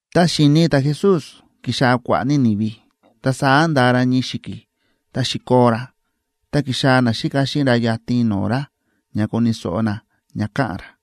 Ta xi̱ni ta̱Jesús ki̱xaa̱ kua̱ꞌa̱ ní ni̱vi, ta saá nda̱a ra ñii xi̱ki̱, ta xi̱koo ra, ta ki̱xaa̱ naxíka xíꞌin ra yatin no̱o̱ ra ña koni̱ so̱ꞌo na ña ka̱ꞌa̱n ra.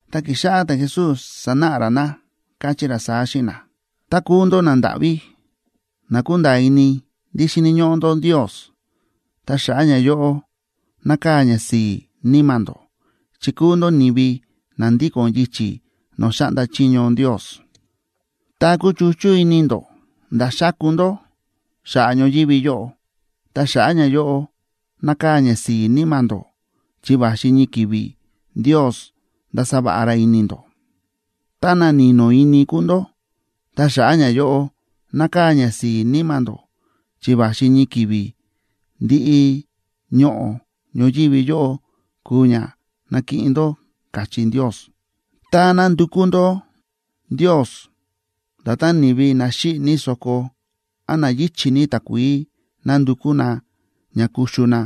Ta ki̱xáꞌá ta̱Jesús sánáꞌa ra na, káchí ra saá xíꞌin na: ―Tá kúu ndó nandáꞌví, na kúnda̱a̱ ini ndí xíni̱ ñóꞌó ndó Ndios, ta xa̱ꞌa̱ ñayóꞌo nákaa̱ ñasi̱i̱ níma̱ ndó, chi kúu ndó ni̱vi na ndíko̱n yichi̱ no̱o̱ xáꞌnda chiño Ndios. ’Tá kúchuchú ini ndó nda̱ xáku ndó xa̱ꞌa̱ ñoyívi yóꞌo, ta xa̱ꞌa̱ ñayóꞌo nákaa̱ ñasi̱i̱ níma̱ ndó, chi va̱xi ñii ki̱vi̱ Ndios ndasa va̱ꞌa ra ini ndó. ’Tá na ni̱no̱ ini kúu ndó, ta xa̱ꞌa̱ ñayóꞌo nákaa̱ ñasi̱i̱ níma̱ ndó, chi va̱xi ñii ki̱vi̱ ndiꞌi ñoꞌo̱ ñoyívi yóꞌo kuu ña nakiꞌin ndó, káchí Ndios. ’Tá nándukú ndó Ndios, nda̱tán ni̱vi na xíꞌi̱ ní so̱ko án na yíchi̱ ní takuií nándukú na ña kuxu na,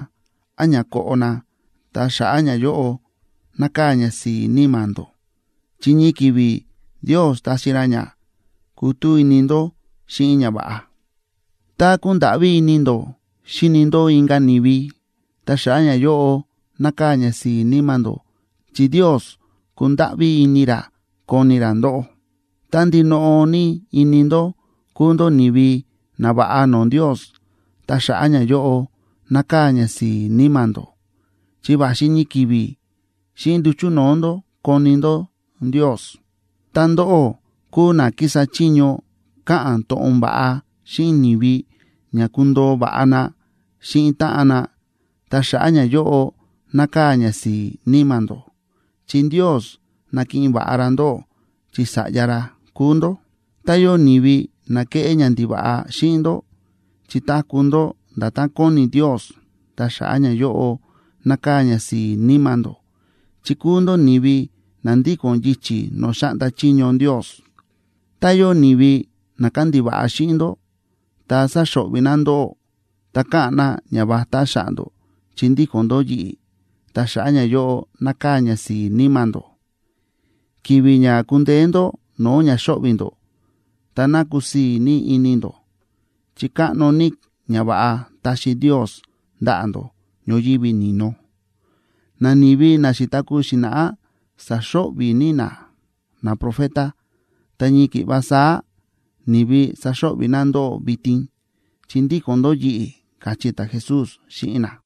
án ña koꞌo na, ta xa̱ꞌa̱ ñayóꞌo nákaa̱ ñasi̱i̱ níma̱ ndó, chi ñii ki̱vi̱ Ndios taxi ra ña kutú ini ndó xíꞌin ñava̱ꞌa. ’Tá kúndáꞌví ini ndó xíni ndó inka̱ ni̱vi, ta xa̱ꞌa̱ ñayóꞌo nákaa̱ ñasi̱i̱ níma̱ ndó, chi Ndios kundáꞌví ini ra koni ra ndóꞌó. ’Tá ndinoꞌo ní ini ndó kúu ndó ni̱vi nava̱ꞌa no̱o̱ Ndios, ta xa̱ꞌa̱ ñayóꞌo nákaa̱ ñasi̱i̱ níma̱ ndó, chi va̱xi ñii ki̱vi̱ xíꞌin nduchu̱ no̱o̱ ndó koni ndó Ndios. ’Tá ndóꞌó kúu na kísa chiño káꞌa̱n to̱ꞌon va̱ꞌa xíꞌin ni̱vi ña kundoo va̱ꞌa na xíꞌin táꞌan na, ta xa̱ꞌa̱ ñayóꞌo nákaa̱ ñasi̱i̱ níma̱ ndó, chi Ndios nakiꞌin va̱ꞌa ra ndóꞌó chi sa̱ꞌya ra kúu ndó. ’Tá yóo ni̱vi na kéꞌé ñandiva̱ꞌa xíꞌin ndó chi táku̱ ndó nda̱tán kóni Ndios, ta xa̱ꞌa̱ ñayóꞌo nákaa̱ ñasi̱i̱ níma̱ ndó, chi kúu ndó ni̱vi na ndíko̱n yichi̱ no̱o̱ xáꞌnda chiño Ndios. ’Tá yóo ni̱vi na kándiva̱ꞌa xíꞌin ndó, ta sáxo̱ꞌvi̱ na ndóꞌó, ta káꞌa̱n na ñavatá xa̱ꞌa̱ ndó chi ndíko̱n ndó yi̱ꞌi̱, ta xa̱ꞌa̱ ñayóꞌo nákaa̱ ñasi̱i̱ níma̱ ndó. Ki̱vi̱ ña ku̱ndeé ndó no̱o̱ ña xóꞌvi̱ ndó, ta ná kusii̱ ní ini ndó, chi káꞌno ní ñava̱ꞌa taxi Ndios ndaꞌa̱ ndó ñoyívi ni̱no. Nani̱vi na xi̱taku̱ xi̱na̱ꞌá sa̱xo̱ꞌvi̱ ní na naprofeta, ta ñii ki̱ꞌva saá ni̱vi saxo̱ꞌvi̱ na ndóꞌó vitin, chi ndíko̱n ndó yi̱ꞌi̱ ―káchí ta̱Jesús xíꞌin na.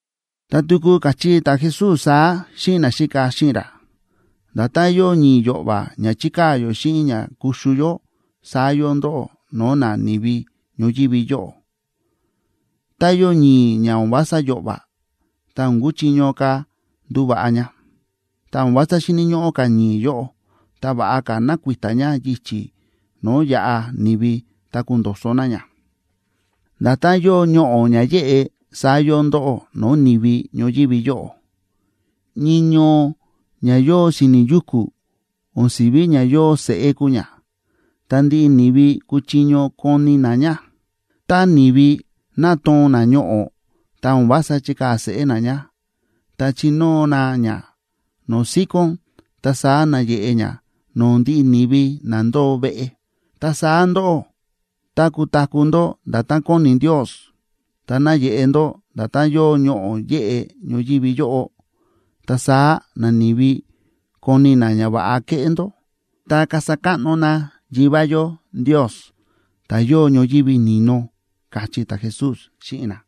Ta tuku káchí ta̱Jesús saá xíꞌin naxíka xíꞌin ra: ―Nda̱tán yóo ñi̱i̱ yo̱ꞌva̱ ña chíkaa̱ yó xíꞌin ña kuxu yó, saá yóo ndóꞌó no̱o̱ nani̱vi ñoyívi yóꞌo. Tá yóo ñi̱i̱ ña o̱n vása yo̱ꞌva̱, ta o̱n kuchiño ka̱ nduva̱ꞌa ña. Ta o̱n vása xíni̱ ñóꞌó ka̱ ñi̱i̱ yóꞌo, ta va̱ꞌa ka̱ ná kui̱ta̱ ña yichi̱ no̱o̱ yaꞌa ni̱vi ta kundo̱so̱ na ña. ’Nda̱tán yóo ñoꞌo̱ ña yéꞌe, saá yóo ndóꞌó no̱o̱ ni̱vi ñoyívi yóꞌo. Ñii ñoo ña yóo si̱ni̱ yuku̱, o̱n si̱ví ña yóo seꞌé kúu ña, ta ndiꞌi ni̱vi kúchiño koni na ña. Tá ni̱vi nátoo̱n na ñoꞌo̱, ta o̱n vása chíkaa̱ seꞌé na ña, ta chínóo na ña no̱o̱ síkón, ta saá náyeꞌe ña no̱o̱ ndiꞌi ni̱vi na ndóo veꞌe. Ta saá ndóꞌó, tá kutaku̱ ndó nda̱tán kóni Ndios ta nayeꞌe ndó nda̱tán yóo ñoꞌo̱ yéꞌe ñoyívi yóꞌo, ta saá nani̱vi koni na ñava̱ꞌa keꞌé ndó, ta kasa káꞌno na Yivá yó Ndios, ta̱ yóo ñoyívi ni̱no ―káchí ta̱Jesús xíꞌin na.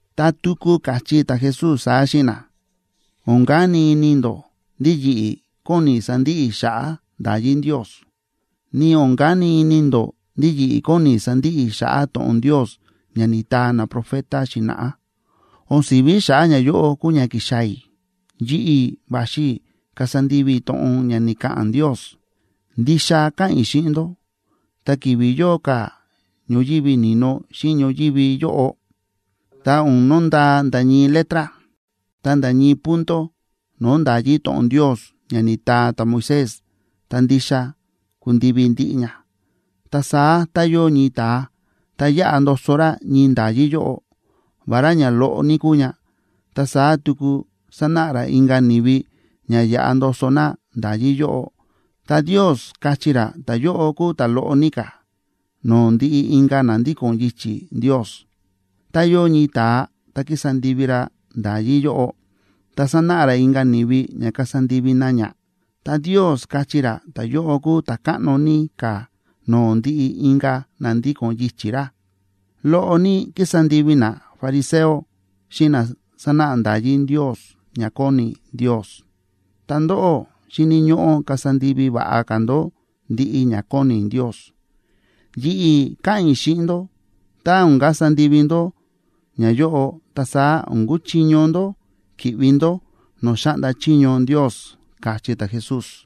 Ta tuku káchí ta̱Jesús saá xíꞌin na: ―O̱n kani ini ndó ndí yi̱ꞌi̱ kóni i̱ sandiꞌi i̱ xa̱ꞌa̱ nda̱yí Ndios, ni o̱n kani ini ndó ndí yi̱ꞌi̱ kóni i̱ sandiꞌi i̱ xa̱ꞌa̱ to̱ꞌon Ndios ña ni̱taa naprofeta xi̱na̱ꞌá. O̱n si̱ví xa̱ꞌa̱ ñayóꞌo kúu ña ki̱xaa̱ i̱; yi̱ꞌi̱ va̱xi i̱ kasa ndivi i̱ to̱ꞌon ña ni̱ka̱ꞌa̱n Ndios. Ndixa káꞌa̱n i̱ xíꞌin ndó, ta ki̱vi̱ yóo ka̱ ñoyívi ni̱no xíꞌin ñoyívi yóꞌo, ta o̱n nondaa nda̱ ñii letra, ta nda̱ ñii punto no̱o̱ nda̱yí to̱ꞌon Ndios ña ni̱taa ta̱Moisés, ta ndixa kundivi ndiꞌi ña. Ta saá tá yóo ñii ta̱a ta yáꞌa ndoso ra ñii nda̱yí yóꞌo, vará ña loꞌo ní kúu ña, ta saá tuku sánáꞌa ra inka̱ ni̱vi ña yaꞌa ndoso na nda̱yí yóꞌo, ta Ndios káchí ra ta̱yóꞌo kúu ta̱ loꞌo ní ka̱ no̱o̱ ndiꞌi inka̱ na ndíko̱n yichi̱ Ndios. Tá yóo ñii ta̱a ta kísa ndivi ra nda̱yí yóꞌo, ta sánáꞌa ra inka̱ ni̱vi ña kasa ndivi na ña, ta Ndios káchí ra ta̱yóꞌo kúu ta̱ káꞌno ní ka̱ no̱o̱ ndiꞌi inka̱ na ndíko̱n yichi̱ ra. Loꞌo ní kísa ndivi nafariseo xíꞌin na sánáꞌa nda̱yí Ndios ña kóni Ndios. Ta ndóꞌó, xíni̱ ñóꞌó kasa ndivi va̱ꞌa ka̱ ndó ndiꞌi ña kóni Ndios. Yi̱ꞌi̱ káꞌa̱n i̱ xíꞌin ndó, tá o̱n kasa ndivi ndó ñayóꞌo, ta saá o̱n kuchiño ndó ki̱ꞌvi ndó no̱o̱ xáꞌnda chiño Ndios ―káchí ta̱Jesús.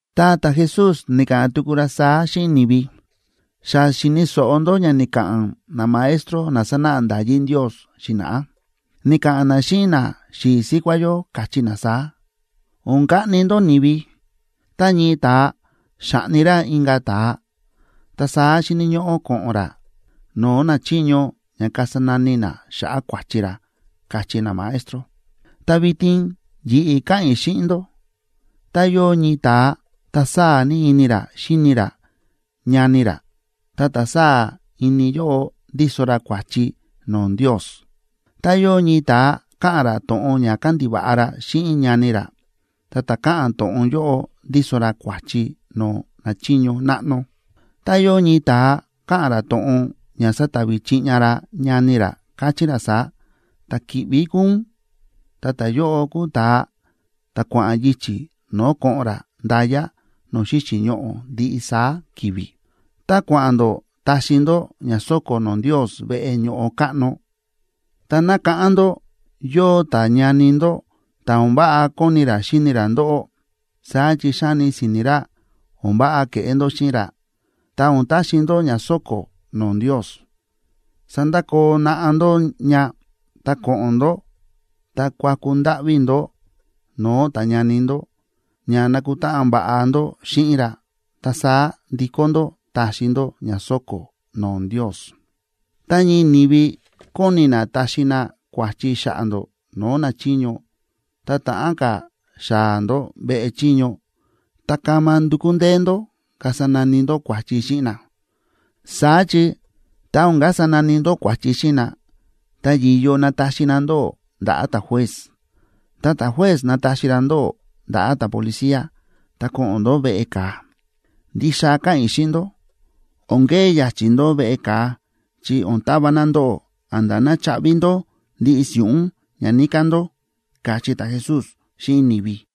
Ta ta̱Jesús ni̱ka̱ꞌa̱n tuku ra saá xíꞌin ni̱vi: ―Xa xi̱ni̱ so̱ꞌo ndó ña ni̱ka̱ꞌa̱n namaestro na sa̱náꞌa nda̱yí Ndios xi̱na̱ꞌá. Ni̱ka̱ꞌa̱n na xíꞌin naxi̱i̱ síkuá yó, káchí na saá: “O̱n kaꞌni ndó ni̱vi. Tá ñii ta̱a xa̱ꞌni ra inka̱ ta̱a, ta saá xíni̱ ñóꞌó ko̱ꞌo̱n ra no̱o̱ nachiño ña kasa nani na xa̱ꞌa̱ kua̱chi ra”, káchí namaestro. Ta vitin yi̱ꞌi̱ káꞌa̱n i̱ xíꞌin ndó, tá yóo ñii ta̱a ta sáa̱ ní ini ra xíni ra ñani ra, ta ta̱ sáa̱ ini yóꞌo ndíso ra kua̱chi no̱o̱ Ndios. Tá yóo ñii ta̱a káꞌa̱n ra to̱ꞌon ña kandiva̱ꞌa ra xíꞌin ñani ra, ta ta̱ káꞌa̱n to̱ꞌon yóꞌo ndíso ra kua̱chi no̱o̱ nachiño náꞌno. Tá yóo ñii ta̱a káꞌa̱n ra to̱ꞌon ña satavi chiꞌña ra ñani ra, káchí ra saá: “Ta̱ kíꞌví kúu ún”, ta ta̱yóꞌo kúu ta̱a ta̱ kua̱ꞌa̱n yichi̱ no̱o̱ ko̱ꞌo̱n ra nda̱ya no̱o̱ xíxi̱ ñoꞌo̱ ndiꞌi saá ki̱vi̱. ’Tá kua̱ꞌa̱n ndó táxi ndó ña so̱ko̱ no̱o̱ Ndios veꞌe ño̱ꞌo káꞌno, ta nákáꞌán ndó yóo ta̱ñani ndó ta o̱n váꞌa kóni ra xíni ra ndóꞌó, saá chi xáni si̱ni̱ ra o̱n váꞌa ke̱ꞌé ndó xíꞌin ra, ta o̱n taxi ndó ña so̱ko̱ no̱o̱ Ndios, sandakoo naꞌá ndó ña, ta ko̱ꞌo̱n ndó ta kuaku ndáꞌví ndó no̱o̱ ta̱ñani ndó ña nakutáꞌan va̱ꞌa ndó xíꞌin ra, ta saá ndikó ndó taxi ndó ña so̱ko̱ no̱o̱ Ndios. ’Tá ñii ni̱vi kóni na taxi na kua̱chi xa̱ꞌa̱ ndó no̱o̱ nachiño, tá ta̱ꞌán ka̱ xaa̱ ndó veꞌe chiño, ta kama ndukú ndee ndó kasa nani ndó kua̱chi xíꞌin na. Saá chi tá o̱n kasa nani ndó kua̱chi xíꞌin na, ta yi̱yo nataxi na ndóꞌó ndaꞌa̱ ta̱juez. Ta ta̱juez nataxi ra ndóꞌó ndaꞌa̱ ta̱policía, ta ko̱ꞌo̱n ndó veꞌe ka̱a. Ndixa káꞌa̱n i̱ xíꞌin ndó, o̱n kee ya̱chi̱ ndó veꞌe ka̱a chi o̱n tava na ndóꞌó a̱nda̱ ná chaꞌvi ndó ndiꞌi si̱ꞌún ña níká ndó ―káchí ta̱Jesús xíꞌin ni̱vi.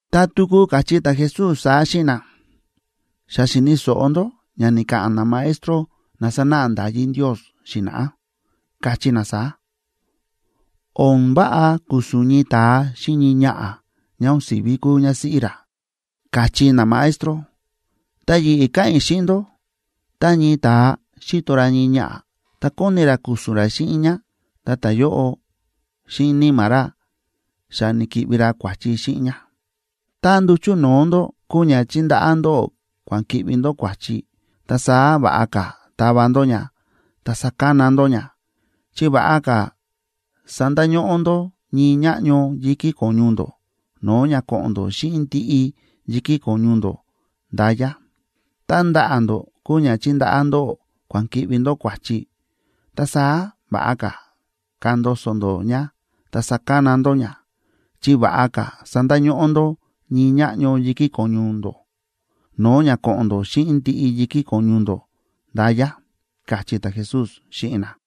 Ta tuku káchí ta̱Jesús saá xíꞌin na: ―Xa xi̱ni̱ so̱ꞌo ndó ña ni̱ka̱ꞌa̱n namaestro na sa̱náꞌa nda̱yí Ndios xi̱na̱ꞌá, káchí na saá: “O̱n váꞌa ku̱su̱n ñii ta̱a xíꞌin ñii ñaꞌa̱ ñá o̱n si̱ví kúu ñásíꞌí ra”, káchí namaestro. Ta yi̱ꞌi̱ káꞌa̱n i̱ xíꞌin ndó, tá ñii ta̱a xíto ra ñii ñaꞌa̱ ta kóni ra ku̱su̱n ra xíꞌin ñá, ta ta̱yóꞌo xíꞌin níma̱ ra xa ni̱ki̱ꞌvi ra kua̱chi xíꞌin ñá. ’Tá nduchu̱ no̱o̱ ndó kúu ña chíndaꞌá ndóꞌó kua̱n ki̱ꞌvi ndó kua̱chi, ta saá va̱ꞌa ka̱ tava ndó ña ta sakana ndó ña. Chi va̱ꞌa ka̱ sandañóꞌó ndó ñii ñáꞌño yi̱kí ko̱ñu ndó, no̱o̱ ña ko̱ꞌo̱n ndó xíꞌin ndiꞌi yi̱kí ko̱ñu ndó nda̱ya. Tá ndaꞌa̱ ndó kúu ña chíndaꞌá ndóꞌó kua̱n ki̱ꞌvi ndó kua̱chi, ta saá va̱ꞌa ka̱ kandoso ndó ña ta sakana ndó ña. Chi va̱ꞌa ka̱ sandañóꞌó ndó ñii ñáꞌño yi̱kí ko̱ñu ndó, no̱o̱ ña ko̱ꞌo̱n ndó xíꞌin ndiꞌi yi̱kí ko̱ñu ndó nda̱ya ―káchí ta̱Jesús xíꞌin na.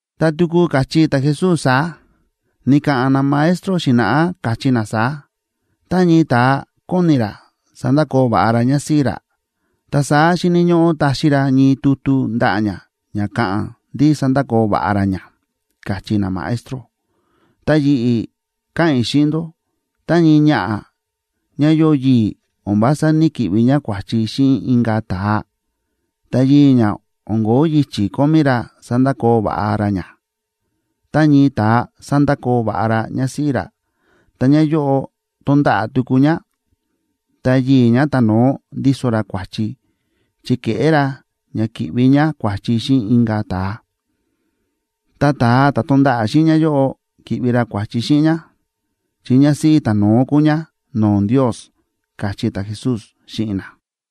Ta tuku káchí ta̱Jesús saá: ―Ni̱ka̱ꞌa̱n namaestro xi̱na̱ꞌá, káchí na saá: “Tá ñii ta̱a kóni ra sandakoo va̱ꞌa ra ñásíꞌí ra, ta saá xíni̱ ñóꞌó taxi ra ñii tutu ndaꞌa̱ ñá ña káꞌa̱n ndí sa̱ndakoo va̱ꞌa ra ñá”, káchí namaestro. Ta yi̱ꞌi̱ káꞌa̱n i̱ xíꞌin ndó, tá ñii ñaꞌa̱ ñá yóo yii̱ o̱n vása ní‑kiꞌvi ñá kua̱chi xíꞌin inka̱ ta̱a, ta yii̱ ñá o̱n ko̱ó yichi̱ kómí ra sandakoo va̱ꞌa ra ñá. Tá ñii ta̱a sándakoo va̱ꞌa ra ñásíꞌí ra, ta ñáyóꞌo tonda̱ꞌa̱ tuku ñá, ta yii̱ ñá ta̱no̱ó ndíso ra kua̱chi, chi ke̱ꞌé ra ña ki̱ꞌvi ñá kua̱chi xíꞌin inka̱ ta̱a. Ta ta̱a ta̱ tonda̱ꞌa̱ xíꞌin ñáyóꞌo ki̱ꞌvi ra kua̱chi xíꞌin ñá, chi ñásíꞌí ta̱no̱ó kúu ñá no̱o̱ Ndios ―káchí ta̱Jesús xíꞌin na.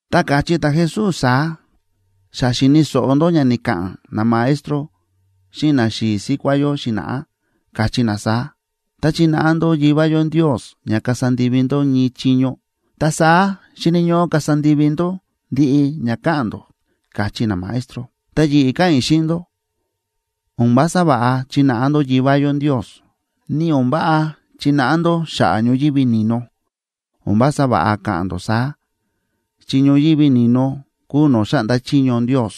Ta káchí ta̱Jesús saá: ―Xa xi̱ni̱ so̱ꞌo ndó ña ni̱ka̱ꞌa̱n namaestro xíꞌin naxi̱i̱ síkuá yó xi̱na̱ꞌá, káchí na saá: “Tá chínáꞌa ndó Yivá yó Ndios ña kasa ndivi ndó ñii chiño, ta saá xíni̱ ñóꞌó kasa ndivi ndó ndiꞌi ña káꞌa̱n ndó”, káchí namaestro. Ta yi̱ꞌi̱ káꞌa̱n i̱ xíꞌin ndó, o̱n vása va̱ꞌa chináꞌa ndó Yivá yó Ndios. Ni o̱n váꞌa chináꞌa ndó xa̱ꞌa̱ ñoyívi ni̱no. O̱n vása va̱ꞌa ka̱ꞌa̱n ndó saá, chi ñoyívi ni̱no kúu no̱o̱ xáꞌnda chiño Ndios.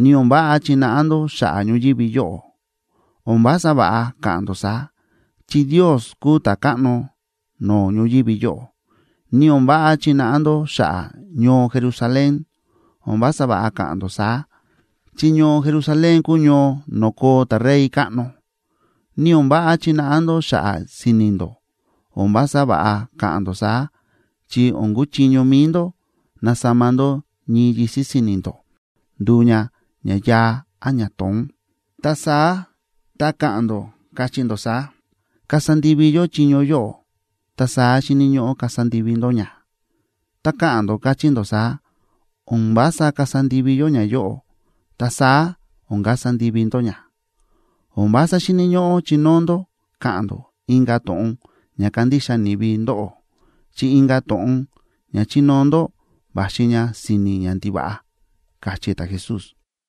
Ni o̱n váꞌa chináꞌa ndó xa̱ꞌa̱ ñoyívi yóꞌo. O̱n vása va̱ꞌa ka̱ꞌa̱n ndó saá, chi Ndios kúu ta̱káꞌno no̱o̱ ñoyívi yóꞌo. Ni o̱n váꞌa chináꞌa ndó xa̱ꞌa̱ ñoo Jerusalén. O̱n vása va̱ꞌa ka̱ꞌa̱n ndó saá, chi ñoo Jerusalén kúu ñoo no̱o̱ koo ta̱Rey káꞌno. Ni o̱n váꞌa chináꞌa ndó xa̱ꞌa̱ si̱ni̱ ndó. O̱n vása va̱ꞌa ka̱ꞌa̱n ndó saá, chi o̱n kuchiño mi̱i ndó nasama ndó ñii yisi̱ si̱ni̱ ndó nduu ña ña yaa án ña to̱ón. Ta saá tá káꞌa̱n ndó, káchí ndó saá: “Kasa ndivi yó chiño yóꞌo”, ta saá xíni̱ ñóꞌó kasa ndivi ndó ña; tá káꞌa̱n ndó, káchí ndó saá: “O̱n vása kasa ndivi yó ñayóꞌo”, ta saá o̱n kasa ndivi ndó ña. O̱n vása xíni̱ ñóꞌó chinóo ndó ka̱ꞌa̱n ndó inka̱ to̱ꞌon ña kandixa ni̱vi ndóꞌó, chi inka̱ to̱ꞌon ña chinóo ndó va̱xi ña si̱ni̱ ñandiva̱ꞌa ―káchí ta̱Jesús.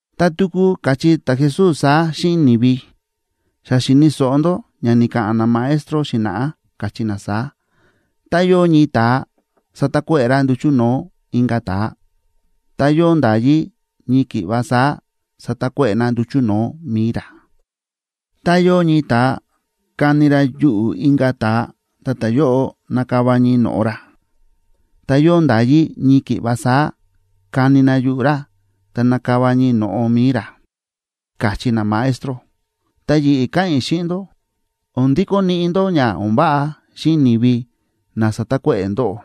Ta tuku káchí ta̱Jesús saá xíꞌin ni̱vi: ―Xa xi̱ni̱ so̱ꞌo ndó ña ni̱ka̱ꞌa̱n namaestro xi̱na̱ꞌá, káchí na saá: “Tá yóo ñii ta̱a sa̱takuéꞌe̱ ra nduchu̱ no̱o̱ inka̱ ta̱a, ta yóo nda̱yí ñii ki̱ꞌva saá satakuéꞌe̱ na nduchu̱ no̱o̱ mi̱i ra. Tá yóo ñii ta̱a ka̱ni ra yuꞌu̱ inka̱ ta̱a ta ta̱yóꞌo na̱kava ñii no̱ꞌo ra, ta yóo nda̱yí ñii ki̱ꞌva saá kani na yuꞌu̱ ra ta nakava ñii no̱ꞌo mi̱i ra”, káchí namaestro. Ta yi̱ꞌi̱ káꞌa̱n i̱ xíꞌin ndó, o̱n ndikó niꞌi ndó ña o̱n váꞌa xíꞌin ni̱vi na sa̱takuéꞌe̱ ndóꞌó.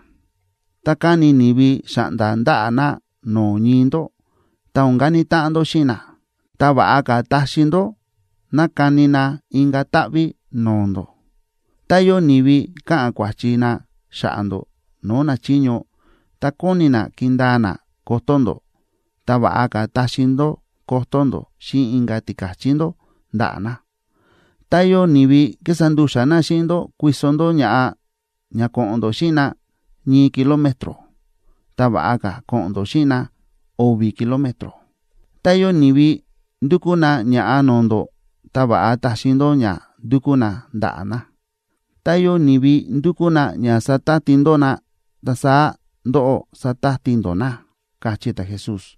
Tá káni ni̱vi xa̱ꞌnda̱ ndaꞌa̱ na no̱o̱ ñii ndó, ta o̱n kani táꞌan ndó xíꞌin na, ta va̱ꞌa ka̱ taxi ndó ná kani na inka̱ táꞌví no̱o̱ ndó. Tá yóo ni̱vi káꞌa̱n kua̱chi na xa̱ꞌa̱ ndó no̱o̱ nachiño, ta kóni na kindaa na kotó ndó, ta va̱ꞌa ka̱ taxi ndó kotó ndó xíꞌin inka̱ tika̱chí ndó ndaꞌa̱ na. Tá yóo ni̱vi kísa ndu̱xa̱ na xíꞌin ndó kuiso ndó ña̱ꞌa ña ko̱ꞌo̱n ndó xíꞌin na ñii kilómetro, ta va̱ꞌa ka̱ ko̱ꞌo̱n ndó xíꞌin na o̱vi̱ kilómetro. Tá yóo ni̱vi ndúkú na ña̱ꞌa no̱o̱ ndó, ta va̱ꞌa taxi ndó ña ndúkú na ndaꞌa̱ na. Tá yóo ni̱vi ndúkú na ña satati ndó na, ta saá ndóꞌó, satati ndó na ―káchí ta̱Jesús.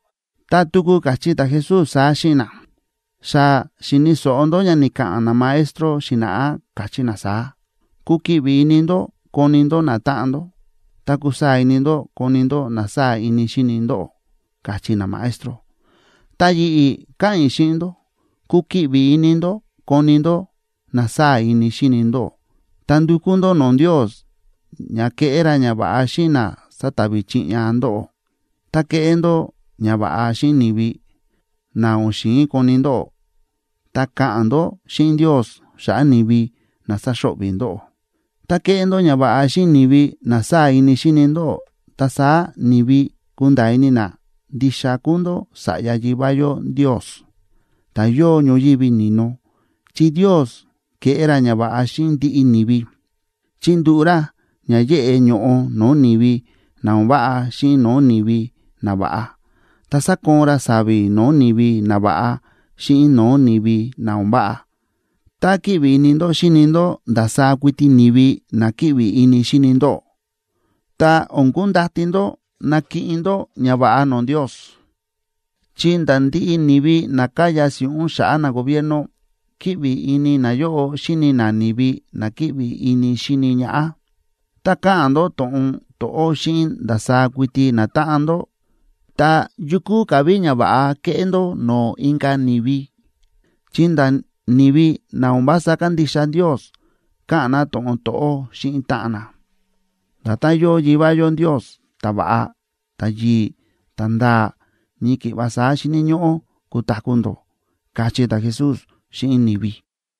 Ta tuku káchí ta̱Jesús saá xíꞌin na: ―Xa xi̱ni̱ so̱ꞌo ndó ña ni̱ka̱ꞌa̱n namaestro xi̱na̱ꞌá, káchí na saá: “Kukiꞌvi ini ndó koni ndó natáꞌan ndó, ta kusaa̱ ini ndó koni ndó na sáa̱ ini xíni ndóꞌó”, káchí namaestro. Ta yi̱ꞌi̱ káꞌa̱n i̱ xíꞌin ndó, kukiꞌvi ini ndó koni ndó na sáa̱ ini xíni ndóꞌó, ta ndukú ndó no̱o̱ Ndios ña keꞌé ra ñava̱ꞌa xíꞌin na sátavi chiꞌña ndóꞌó. Ta keꞌé ndó ñava̱ꞌa xíꞌin ni̱vi na o̱n xi̱in koni ndóꞌó, ta ka̱ꞌa̱n ndó xíꞌin Ndios xa̱ꞌa̱ ni̱vi na sáxo̱ꞌvi̱ ndóꞌó. Tá kéꞌé ndó ñava̱ꞌa xíꞌin ni̱vi na sáa̱ ini xíni ndóꞌó, ta saá ni̱vi kunda̱a̱ ini na ndixa kúu ndó sa̱ꞌya Yivá yó Ndios, ta̱ yóo ñoyívi ni̱no. Chi Ndios kéꞌé ra ñava̱ꞌa xíꞌin ndiꞌi ni̱vi; chíndúꞌu̱ ra ña yeꞌe ño̱ꞌo no̱o̱ ni̱vi na o̱n váꞌa xíꞌin no̱o̱ ni̱vi nava̱ꞌa, ta sákoon ra sa̱vi̱ no̱o̱ ni̱vi nava̱ꞌa xíꞌin no̱o̱ ni̱vi na o̱n váꞌa. Tá kíꞌvi ini ndó xíni ndó ndasaá kuiti ni̱vi na kíꞌvi ini xíni ndóꞌó, ta o̱n kundati ndó nakiꞌin ndó ñava̱ꞌa no̱o̱ Ndios, chi nda̱ ndiꞌi ni̱vi na káya si̱ꞌún xa̱ꞌa̱ nagobierno kíꞌvi ini nayóꞌo xíni na ni̱vi na kíꞌvi ini xíni ñaꞌá. Tá káꞌa̱n ndó to̱ꞌon to̱ꞌó xíꞌin ndasaá kuiti natáꞌan ndó, ta, ¿yu kúu ka̱ ví ñava̱ꞌa kéꞌé ndó no̱o̱ inka̱ ni̱vi?, chi nda̱ ni̱vi na o̱n vása kándixa Ndios káꞌa̱n na to̱ꞌon to̱ꞌó xíꞌin táꞌan na. Nda̱tán yóo Yivá yó Ndios ta̱va̱ꞌa, ta̱yi̱i̱, ta̱nda̱a̱, ñii ki̱ꞌva saá xíni̱ ñóꞌó kutaku̱ ndó ―káchí ta̱Jesús xíꞌin ni̱vi.